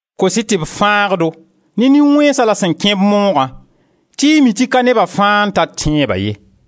Kos-y tɩ b fãag-do ne nin-wẽnsã la sẽn kẽ-b moogã tɩ y mi tɩ ka neba fãa n tar tẽeba ye.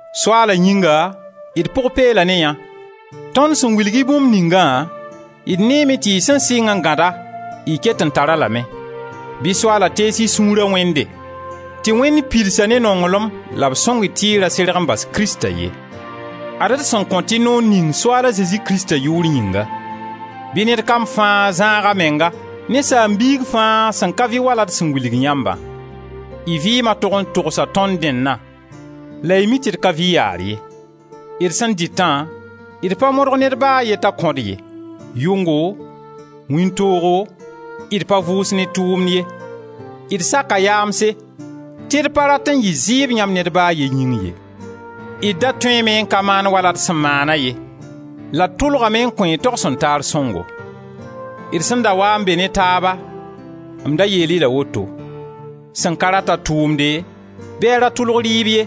Soaala yĩnga d pʋg peela ne yã; tõnd sẽn wilg-y bũmb ningã, d neeme tɩ y sẽn sɩng n gãd-a, y ket n tar-a lame. Bɩ Soaala tees y sũura Wẽnde, tɩ Wẽnd pids-a ne nonglem la b sõng-y tɩ y ra serg n bas Krista ye. Ad-d sẽn kõt-y noor ning Soaala Zezi Krista yʋʋr yĩnga: bɩ ned kam fãa zãag a menga ne saam-biig fãa sẽn ka vɩ wala d sẽn wilg yãmbã. Y vɩɩma tog n togsa tõnd dẽnna la y mi tɩ d ka vɩ yaar ye. D sẽn dɩtã, d pa modg ned ba a ye t'a kõ-d ye. Yʋngo, wĩntoogo, d pa vʋʋs ne tʋʋmd ye. D saka yaamse, tɩ d pa rat n yɩ zɩɩb yãmb ned ba a ye yĩng ye. D da tõeeme n ka maan wala d sẽn maana ye, la d tʋlgame n kõ-y togsen-taar sõngo. D sẽn da waa n be ne taaba m da yeel-y la woto: sẽn ka rat-a tʋʋmde bɩ a ra tʋlg rɩɩb ye.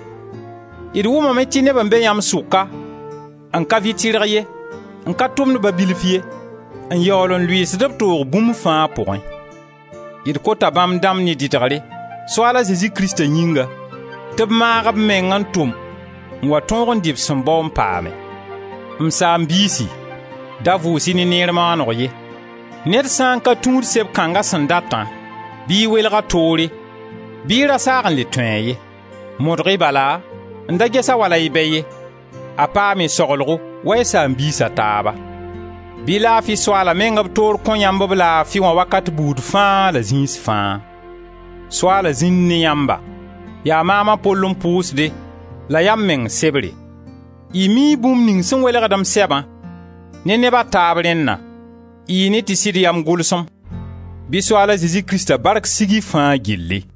D wʋmame tɩ neb n be yãmb sʋka n ka vɩ tɩrg ye, n ka tʋmd ba bilf ye, n yaool n lʋɩɩsd b toog bũmb fãa pʋgẽ. D kota bãmb dãmb ne dɩdgre, Soaal a Zezi Krista yĩnga tɩ b maag b meng n tʋm n wa tõog n dɩ b sẽn bao n paame. M saam-biisi, da vʋʋs-y ne neer maaneg ye. Ned sã n ka tũud sebr kãnga sẽn datã, bɩ y welg-a toore, bɩ y ra saag n le tũ-a ye. Modg-y bala n da ges-a wala y bɛ ye; a paam y saglgo wa y saam-biis a taaba. Bɩ laafi Soaala meng b toore kõ yãmb b laafi wã wakat buud fãa la zĩis fãa. Soaala zĩnd ne yãmba! Yaa maam a Pol n pʋʋsde la yaa m meng sebre. Y mii bũmb ning sẽn welgd m sɛbã ne neba taab rẽnna. Y ne tɩ sɩd yaa m gʋlsem. Bɩ Soaal a Zezi Krista bark sig y fãa gilli!